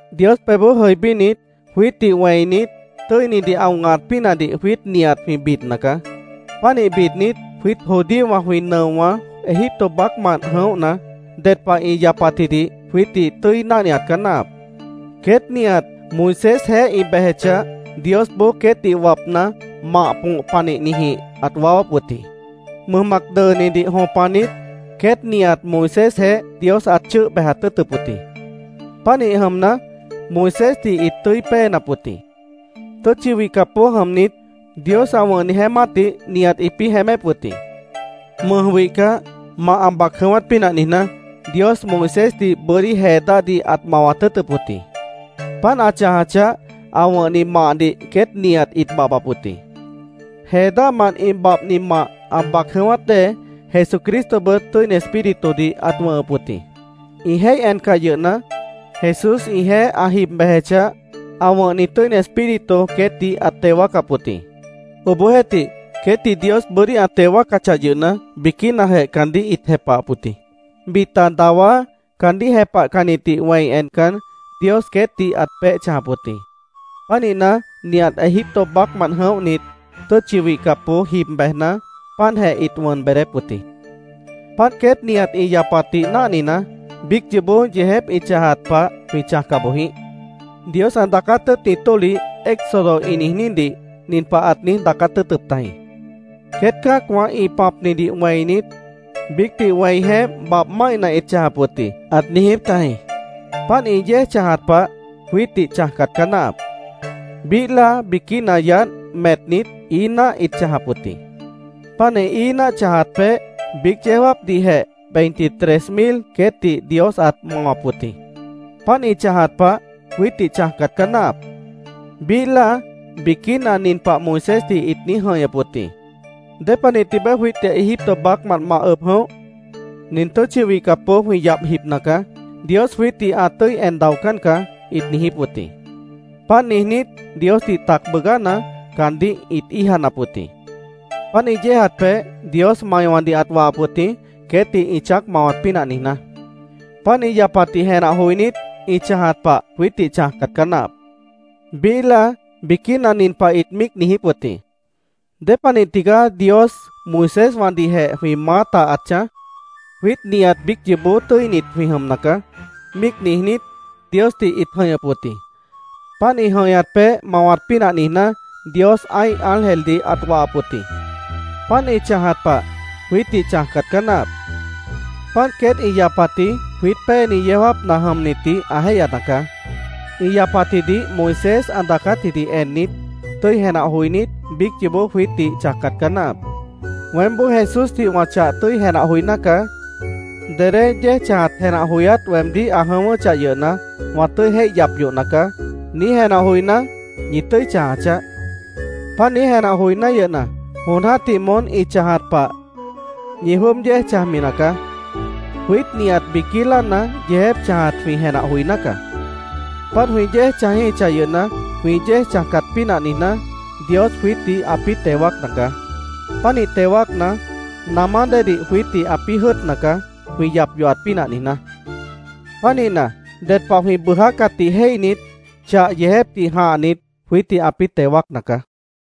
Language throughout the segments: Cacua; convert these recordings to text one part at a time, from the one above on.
Dios pebhboó jʉibínit, jwiítdih wẽinit, tʉ́inidih ã wʉ̃hat pínahdih jwiít nihat jwĩ bidna caá. Pánih bidnit, jwiít judíowã jwĩ nʉowã Egipto baácmant jʉ̃óhna, ded pah ĩ yapatjidih jwiítdih tʉ́i náhniat caá náahap. Queét nihat Moisésjeéh ĩ bejechah, Diosboó queétdih wapna, mah põh panihnijĩh ãt waáwáp wʉt jĩ. Mʉj Mac Dʉʉnidih jõpanit, queét nihat Moisésjeéh Dios ãt chʉ́ʉh bejat tʉ́ʉtʉp wʉt jĩ. Pánih jʉmna, Moisésdih ĩt tʉ́i péenap wʉt jĩ. Tʉ́tchi wihcapboó jʉmnit, Dios ã wʉ̃hni jeémátdih nihat ĩpĩ́ jeémép wʉt jĩ. Mʉj wihcah, mah ã bac jʉ̃ʉ́wát pínah niijná, Dios Moisésdih bʉ́dí jee dáhdih ãt mawat tʉ́ʉtʉp wʉt jĩ. Páant ã chãjachah, ã wʉ̃hni mahdih queét nihat ĩt babhbap wʉt jĩ. Jee dáhmant ĩ babhni mah ã bac jʉ̃ʉ́wát dée, Jesucristobʉt Tʉ́ini Espíritudih ãt wʉ̃hʉp wʉt jĩ. Ĩ jéih encah yʉhna, Jesús ĩjeéh ã jib bejechah, ã wʉ̃hni Tʉ́ini Espíritu queétdih ãt teo wáacap wʉt jĩ. Obohjeéhtih, queétdih Dios bʉ́dí ã teo wáacachah yʉhna, biquínajeh caandíh ĩt jepahap wʉt jĩ. Bita dawá caandíh jepahcannitdih wẽi encan, Dios queétdih ãt peéh chãjap wʉt jĩ. Pánihna, nihat Egipto baácmant jʉ̃óhnit, tʉ́tchi wihcapboó jib bejna, páantjeh ĩt wʉn beedép wʉt jĩ. Páant queét nihat ĩ yapatdih náhnina, biíc yoobó yeejép ĩ chãjat pah jwĩ chãjca boj jĩíh. Dios ã daacát tʉ́ʉtni tólih, Éxodo ĩ niijnídih, nin pah ãt niíj daacát tʉ́ʉtʉp tajĩ: “Queét cã́acwã ĩ pãpnidih wẽinit, biícdih wẽi jeémp babh máihna ĩt chãjap wʉt jĩ”, ãt niijíp tajĩ. Páant ĩ yéej chãjat pah, jwiítdih chãjcat caá náahap. Biíh láa biquína yaádh metnit, ií náah ĩt chãjap wʉt jĩ. Páant ĩ ií náah chãjat peéh biíc yeó jáapdihjeh veintitrés mil queétdih Dios ãt mawap wʉt jĩ. Páant ĩ chãjat pah, jwiítdih chãjcat caá náahap. Biíh láa, biquína nin pah Moisésdih ĩt niíj jʉ̃ihñʉp wʉt jĩ: “¿Dépanih tibeé jwiítdih Egipto baácmant ma ʉb jʉ̃óh? Nin tʉ́tchi wihcapboó jwĩ yabh jibna caá. Dios jwiítdih ã tʉ́i en daocán caá”, ĩt niijíp wʉt jĩ. Páant niijnít, Diosdih tac bʉʉgána, caandíh ĩt íijanap wʉt jĩ. Páant ĩ yéejat peéh, Dios maiwãdih ãt wahap wʉt jĩ, queétdih ĩ chãác mawat pínah niijná. Páant ĩ yapatdih jenah joinít, ĩ chãjat pah jwiítdih chãjcat caá náahap. Biíh láa, biquína nin pah ĩt míic niijíp wʉt jĩ: “¿Dépanih tigaá Dios Moiséswãdihjeh jwĩ maáta ãt chãj? Jwiít nihat biíc yoobó tʉ́init jwĩ jʉmna caá”, míic niijnít, Diosdih ĩt jʉ̃ihñʉp wʉt jĩ. Páant ĩ jʉ̃ihñat peéh mawat pínah niijná, Dios ã́ih ángeldih ãt wahap wʉt jĩ. Páant ĩ chãjat pah, jwiítdih chãjcat caá náahap. Páant queét ĩ yapatji jwiít péeni yeó jáapna jʉmnitdih ã jéihyana caá. Ĩ yapatjidih Moisés ã daacátjidih ennit, tʉ́i jenah joinít, biíc yoobó jwiítdih chãjcat caá náahap. “Weémboó Jesúsdih wã chah tʉ́i jenah joiná caá. Dedé yéej chãjat jenah joyát weemdíh ã jʉ̃ʉ́wʉ́chah yʉhna, wã tʉ́i jéih yap yohna caá”, niíj jenah joiná, ñi tʉ́i chãja chaáh. Páant niíj jenah joiná yʉhna, jon jã́tih moón ĩ chãjat pah, ñi jwʉ́ʉb yéej chãjmi nacaá. Jwiít nihat biquí láana yeejép chãjat jwĩ jenah joiná caá. Páant jwĩ yéej chãjíhichah yʉhna, jwĩ yéej chãjcat pínah niijná, Dios jwiítdih ãpĩ́ teo wáacna caá. Pánih teo wáacna, namá déedih jwiítdih ãpĩ́ jʉ́ʉtna caá, jwĩ yap yohat pínah niijná. Pánihna, ded pah jwĩ bʉʉjácatdih jéihnit, chah yeejépdih jãhnit, jwiítdih ãpĩ́ teo wáacna caá.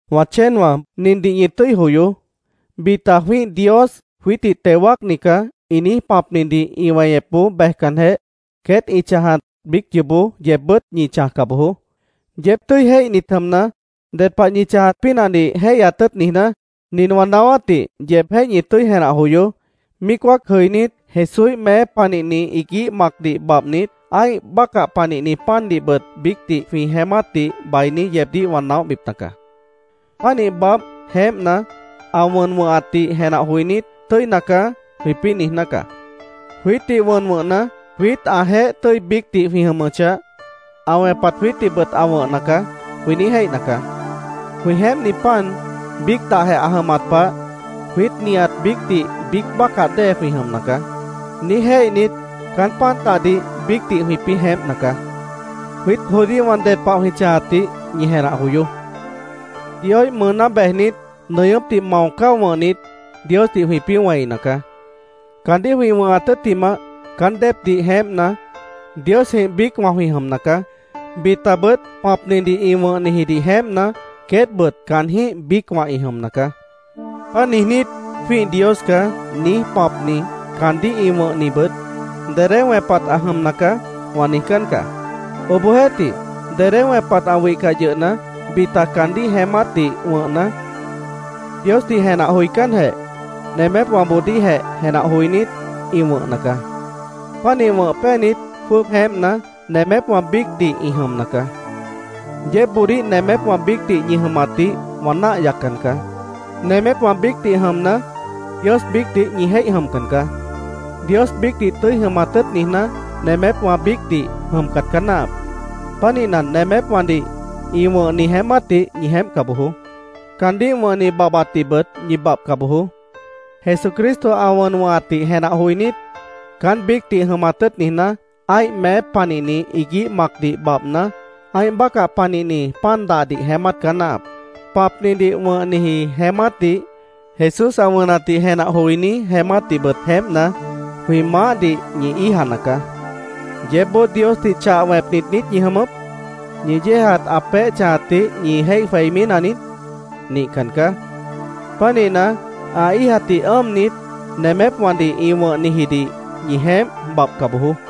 Wã chéenwã, nindih ñi tʉ́i joyoó: Bita “Jwĩ́ih dios, jwiítdih teo wáacni caá”, ĩ niíj pãpnidih ĩ weñepboó bejcanjeh, queét ĩ chãjat biíc yoobó yeebbʉ́t ñi chãjca bojoó. Yeéb tʉ́i jéihnit jʉmna, ded pah ñi chãjat pínahdih jéihyat tʉ́ʉt niijná, nin wã naáwátdih yeebjéh ñi tʉ́i jenah joyoó: Míic wáac jʉinít, Jesúíh meép panihni iguíh macdih babhnit, ã́ih bácah panihni pandihbʉt biícdih jwĩ jeémátdih bainí yeebdíh wã naóhbipna caá. Pánih babh, jeémpna, ã wʉn wʉ̃hatdih jenah joinít, “Tʉ́ina caá”, jwĩpĩ́ niijná caá. “Jwiítdih wʉn wʉ̃hna, jwiít ãjeéh tʉ́i biícdih jwĩ jʉmʉchah, ã wẽpat jwiítdihbʉt ã wʉ̃hna caá”, jwĩ niíj jéihna caá. “Jwĩ jeémpni pan biíc dahjeh ã jʉmat pah, jwiít nihat biícdih biíc bácah dée jwĩ jʉmna caá”, niíj jéihnit, caán pan dahdih biícdih jwĩpĩ́ jeémpna caá. Jwiít judíowã ded pah jwĩ chãjatdih ñi jenah joyoó: Dioíh mʉʉná bejnit, nʉñʉ́pdih mao cáo wʉ̃hnit, Diosdih jwĩpĩ́ wẽina caá. Caandíh jwĩ wʉ̃hat tʉ́ttimah, caán déepdih jeémpna, Diosjĩh biícwã jwĩ jʉmna caá. Bitabʉt pãpnidih ĩ wʉ̃hnijidih jeémpna, queétbʉt caanjĩ́h biícwã ĩ jʉmna caá. Páant niijnít, “Jwĩ́ih dios caá”, niíj pãpni, caandíh ĩ wʉ̃hnibʉt “Dedé wẽpat ã jʉmna caá”, wã niijcán caá. Obohjeéhtih, dedé wẽpat ã wihcah yʉhna, bita caandíh jeémátdih wʉ̃hna, Diosdih jenah joicánjeh, nemépwãboodíhjeh jenah joinít, ĩ wʉ̃hna caá. Pánih wʉ̃h péanit, jwʉ́ʉb jeémpna, nemépwã biícdih ĩ jʉmna caá. Yeébboodíh nemépwã biícdih ñi jʉmatdih wã náah yaccan caá. Nemépwã biícdih jʉmna, Dios biícdih ñi jéih jʉmcan caá. Dios biícdih tʉ́i jʉmat tʉ́ʉt niijná, nemépwã biícdih jʉmcat caá náahap. Pánihna, nemépwãdih ĩ wʉ̃hni jeémátdih ñi jeémpca bojoó. Caandíh wʉ̃hni babhbatdihbʉt ñi babhca bojoó. Jesucristo ã wʉn wʉ̃hatdih jenah joinít, caán biícdih jʉmat tʉ́ʉt niijná, ã́ih meép panihni iguíh macdih babhna, ã́ih bácah panihni pan dahdih jeémát caá náahap. Pãpnidih wʉ̃hniji jeémátdih, Jesús ã wʉnatdih jenah joiní jeémátdihbʉt jeémpna, jwĩ Maáhdih ñi íijana caá. ¿Yeébboó Diosdih chah wẽpnit niít ñi jʉmʉp? ¿Ñi yéejat ã peéh chãjatdih ñi jéih jweimí naniít? Nihcan caá. Pánihna, ã íijatdih ʉ́ʉmnit, nemépwãdih ĩ wʉ̃hnijidih ñi jeémp, babhca bojoó.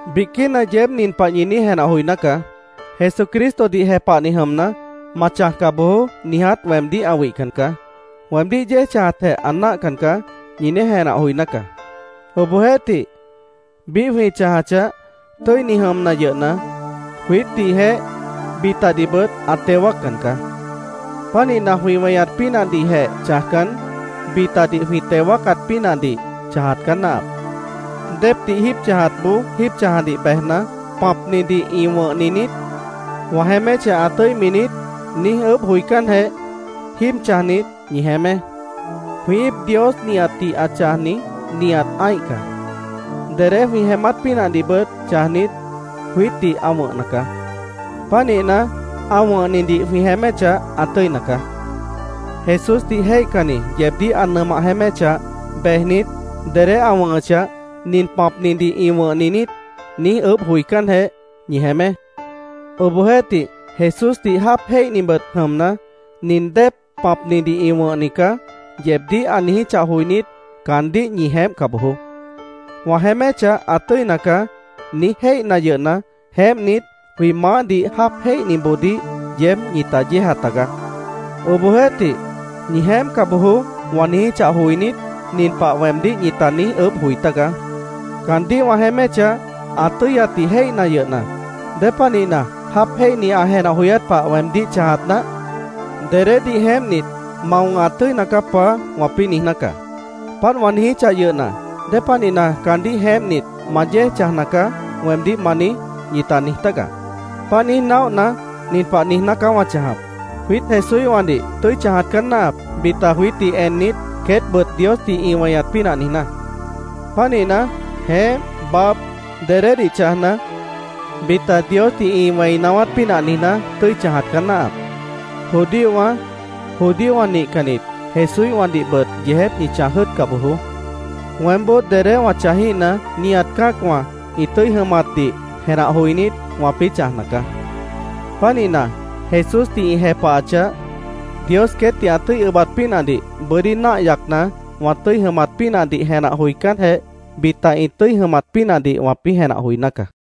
Biquína yeéb nin pah ñi niíj jenah joiná caá: “Jesucristodih jepahni jʉmna, ‘Ma chãjca bojoó’, niiját weemdíh ã wihcan caá. Weemdíh yéej chãjatjeh ã náahcan caá”, ñi niíj jenah joiná caá. Obohjeéhtih, biíh jwĩ chãjachah, tʉ́ini jʉmna yʉhna, jwiítdihjeh, bitadihbʉt ã teo wáaccan caá. Pánihna, jwĩ weñat pínahdihjeh chãjcan, bitadih jwĩ teo wáacat pínahdih chãjat caá náahap. Déepdih jíib chãjatboó jíib chãjadih bejna, “¿Pãpnidih ĩ wʉ̃hni niít? ¿Wã jeéméchah, ã tʉ́imi niít?” niíj ʉʉ́bh joicánjeh, jíib chãjnit, ñi jeémé. Jwĩ íip Dios nihatdih ã chãjni, nihat ã́ih caá. Dedé jwĩ jeémát pínahdihbʉt chãjnit, jwiítdih ã wʉ̃hna caá. Pánihna, ã wʉ̃hnidih jwĩ jeéméchah, ã tʉ́ina caá. Jesúsdih jéihcanni yeebdíh ã nʉmah jeéméchah, bejnit, dedé ã wʉ̃hʉchah, “¿Nin pãpnidih ĩ wʉ̃hni niít?” niíj ʉʉ́bh joicánjeh, ñi jeémé. Obohjeéhtih, Jesúsdih jáap jéihnibʉt jʉmna, “Nin déep pãpnidih ĩ wʉ̃hni caá”, yeebdíh ã niijíchah joinít, caandíh ñi jeémpca bojoó. “Wã jeéméchah, ã tʉ́ina caá”, niíj jéihna yʉhna, jeémpnit, jwĩ Maáhdih jáap jéihniboodíh yeéb ñita yéeja tagaá. Obohjeéhtih, “Ñi jeémpca bojoó”, wã niijíchah joinít, nin pah weemdíh ñita niíj ʉʉ́bh joi tágaá. “Caandíh wã jeéméchah ã tʉ́yatdih jéihna yʉhna, ¿Dépanihna jáap jéihni ã jenah joyát pah weemdíh chãjat náah? Dedédih jeémpnit, ‘Ma wʉ̃hat tʉ́ina caá, Paá’, wãpĩ́ niijná caá. Páant wã niijíchah yʉhna, ¿Dépanihna, ‘Caandíh jeémpnit, ma yéej chãjna caá’, weemdíh ma niíj?” ñita niij tágaá. Páant niíj naóhna, nin pah niijná caá wã chãjap: Jwiít Jesúíhwãdih tʉ́i chãjat caá náahap, bita jwiítdih ennit, queétbʉt Diosdih ĩ weñat pínah niijná. Pánihna, jeémp, babh, dedédih chãjna, bita Diosdih ĩ wẽi naáwát pínah niijná, tʉ́i chãjat caá náahap. Judíowã, judíowã nihcannit, Jesúíhwãdihbʉt yeejép ñi chãj jʉ́ʉtca bojoó. Weémboó dedé wã chãjíhna, nihat cã́acwã ĩ tʉ́i jʉmatdih jenah joinít, wãpĩ́ chãjna caá. Pánihna, Jesúsdih ĩ jepahachah, Dios queétdih ã tʉ́i ʉbat pínahdih bʉ́dí náah yacna, wã tʉ́i jʉmat pínahdih jenah joicánjeh, bita ĩ tʉ́i jʉmat pínahdih wãpĩ́ jenah joiná caá.